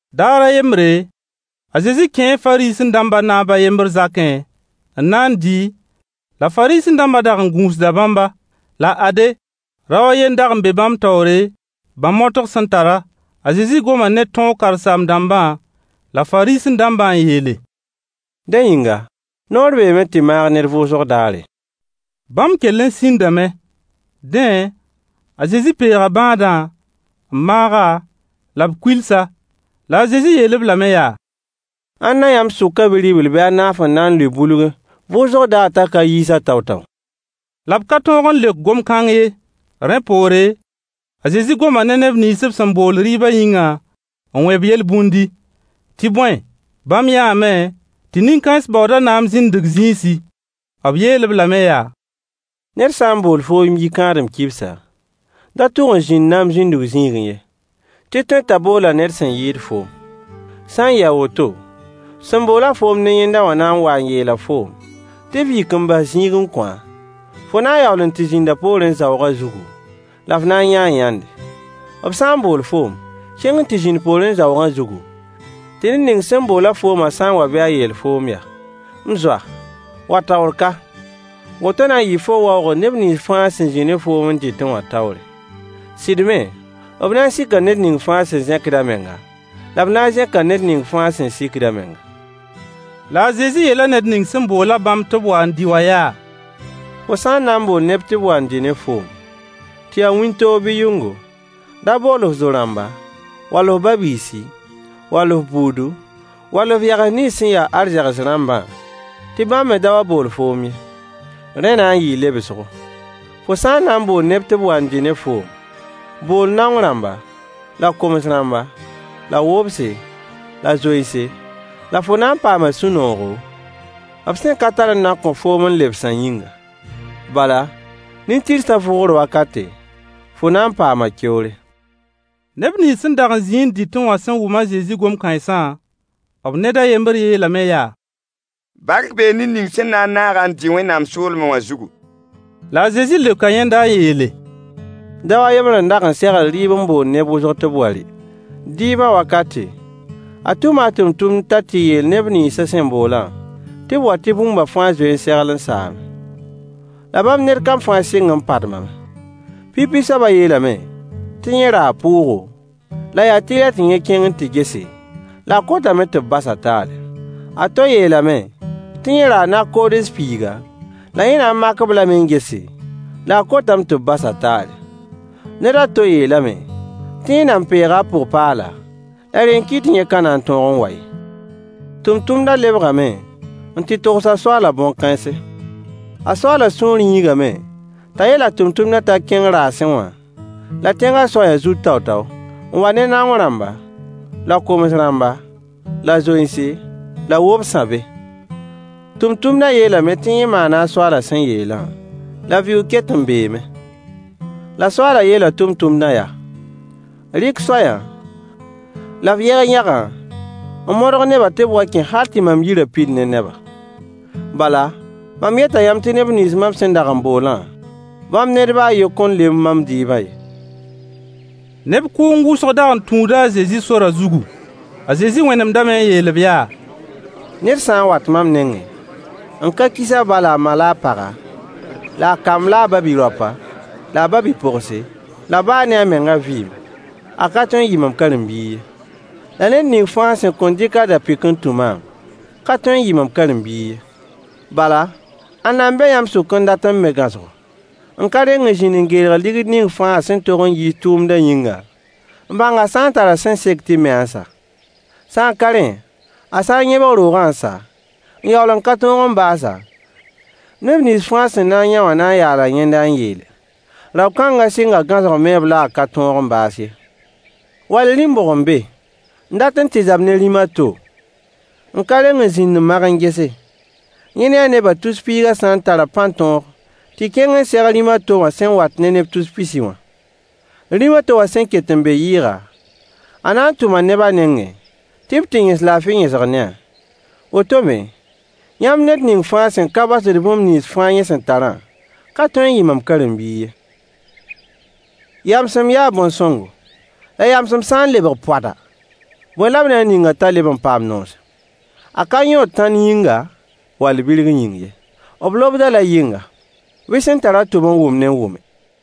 Daar a yembre, a Zezi kẽe Fariisẽ-dãmbã naab a yembr zakẽ n na n dɩ, la Fariisẽ-dãmbã dag n gũusda bãmba. La ade, rao a ye n dag n be bãmb taoore, bã-motg sẽn tara. A Zezi goma ne tõog karen-saam-dãmbã la Fariisẽ-dãmba n yeele: Dẽ yĩnga, noor beeme tɩ maag ned vʋʋsg daare? Bãmb kell n sĩndame. Dẽ, a Zezi peega bãadã, n maag-a, la b kuils-a. La a Zezi yeel-b lame yaa: Ãnna yãmb sʋkã bi-ribl bɩ a naaf n na n lʋɩ bulgẽ vʋʋsg daar t'a ka yiis-a tao-tao? La b ka tõog n leok gom kãng ye. Rẽ poore, a Zezi goma ne neb nins b sẽn bool rɩɩbã yĩngã n wẽ-b yel-bũndi. Tɩ bõe, bãmb yãame tɩ nin-kãens baooda naam zĩndg zĩisi. B yeel-b lame yaa: Ned sã n bool foom yi-kãadem kibsa, da tʋg n zĩnd naam zĩndg zĩigẽ ye, tɩ tõe t'a boola ned sẽn yɩɩd foom. Sã n yɩ a woto, sẽn bool-a foom ne yẽnda wã na n waa n yeela foom tɩ f yik n bas zĩig n kõ-a, fo na n yaool n tɩ zĩnda poorẽ zaoogã zugu, la f na n yãa yãnde. B sã n bool foom, kẽng n tɩ zĩnd poorẽ zaoogã zugu, tɩ ned ning sẽn bool-a foomã sã n wa bɩ a yeel foom yaa: “M zoa, wa taoor ka!” Woto na n yɩɩ fo waoogr neb nins fãa sẽn zĩ ne foom n dɩtẽ wã taoore. Sɩd me, b na n sika ned ning fãa sẽn zẽkd a menga, la b na n zẽka ned ning fãa sẽn sikd a menga. La a Zezi yeela ned ning sẽn bool-a bãmb tɩ b wa n dɩ wã yaa: Fo sã n na n bool neb tɩ b wa n dɩ ne foom, tɩ ya wĩntoog bɩ yʋngo, da bool f zo-rãmba, wall f ba-biisi, wall f buudu, wall f yags nins sẽn ya arzegs rãmbã, tɩ bãmb me da wa n bool foom ye. Rẽ na n yɩɩ lebsgo. Fo sã n na n bool neb tɩ b wa n dɩ ne foom, bool naong rãmba, la koms-rãmba, la wobse, la zoense, la fo na n paama sũ-noogo, b sẽn ka tar n na n kõ foom n lebsã yĩnga. Bala, nin-tɩrsã vʋʋgr wakate, fo na n paama keoore. Neb nins sẽn dag n zĩ n dɩtẽ wã sẽn wʋm a Zezi gom kãensã, b ned a yembr yeelame yaa: Bark bee ned ning sẽn na n naag-a n dɩ Wẽnnaam soolmẽ wã zugu! La a Zezi leoka yẽnda n yeele: Dao a yembr n dag n segl rɩɩb n bool neb wʋsg tɩ b wa rɩ. Dɩɩbã wakate, a tʋma a tʋmtʋmd t'a tɩ yeel neb nins a sẽn boolã tɩ b wa tɩ bũmba fãa zoe n segl n saame. La bãmb ned kam fãa sɩng n padmame. Pipi soabã yeelame tɩ yẽ raa pʋʋgo, la yaa tɩlɛ tɩ yẽ kẽng n tɩ gese, la a kotame tɩ b bas-a taale. A to yeelame tɩ yẽ raa nag-koods piiga, la yẽ na n mak-b lame n gese, la a kotame tɩ b bas-a taale. Ned a to yeelame tɩ yẽ nan peega a pʋg-paala, la rẽ n kɩt tɩ yẽ ka na n tõog n wa ye. Tʋmtʋmdã lebgame n tɩ togs a soaalã bõn-kãense. A soaalã sũur yĩigame t'a yeel a tʋmtʋmdã t'a kẽng raasẽ wã, la tẽngã soayã zut tao-tao, n wa ne naong rãmba, la koms-rãmba, la zoense, la wobsã be. Tʋmtʋmdã yeelame tɩ yẽ maana a soaalã sẽn yeelã, la vɩʋʋg ket n beeme. La soaalã yeela tʋmtʋmdã yaa: Rɩk soayã, la f yeg yãgã n modg nebã tɩ b wa kẽ hal tɩ mam yirã pid ne neba. Bala, mam yeta yãmb tɩ neb nins mam sẽn dag n boolã, bãmb ned baa a yen kõn lemb mam dɩɩbã ye. Neb kʋʋng wʋsg dag n tũuda a Zezi sorã zugu. A Zezi wẽnemdame n yeel-b yaa: Ned sã n wat mam nengẽ, n ka kis a ba la a ma la a paga la a kamba la a ba-bi-raopa la a ba-bi-pogse, la baa ne a mengã vɩɩm, a ka tõe n yɩ mam karen-biig ye. La ned ning fãa sẽn kõn dɩk a da-pɩk n tũ maam, ka tõe n yɩ mam karen-biig ye. Bala, ãnna n be yãmb sʋkã n dat n me gãosgo, n ka reng n zĩnd n geel ligd ning fãa a sẽn tog n yiis tʋʋmdã yĩnga, n bãng a sã n tara sẽn sek tɩ me-a n sa? Sã n ka rẽ, a sã n yẽbg roogã n sa, n yaool n ka tõe n baas-a, neb nins fãa sẽn na n yã wã na n yaala yẽnda n yeele: Rao kãngã sɩnga gãosg meeb la a ka tõog n baas ye. Wall rĩm bʋg n be n dat n tɩ zab ne rĩm a to, n ka reng n zĩnd n mag n gese, yẽ ne a nebã tus piigã sã n tara pãn-tõog tɩ kẽng n seg rĩm a to wã sẽn wat ne neb tus pisi wã? Rĩm a to wã sẽn ket n be yɩɩga, a na n tʋma neb a nengẽ tɩ b tɩ yẽs laafɩ yẽsg ne-a. Woto me, yãmb ned ning fãa sẽn ka basd bũmb nins fãa a sẽn tarã ka tõe n yɩ mam karen-biig ye. Yamsem yaa bõn-sõngo. La yamsem sã n lebg poada, bõe la b na n ning-a t'a le paam noosem? A ka yõod tãnd yĩnga, wall birg yĩng ye. B lobd-a la yɩnga. Bɩ sẽn tar-a tʋb n wʋmdẽ wʋme!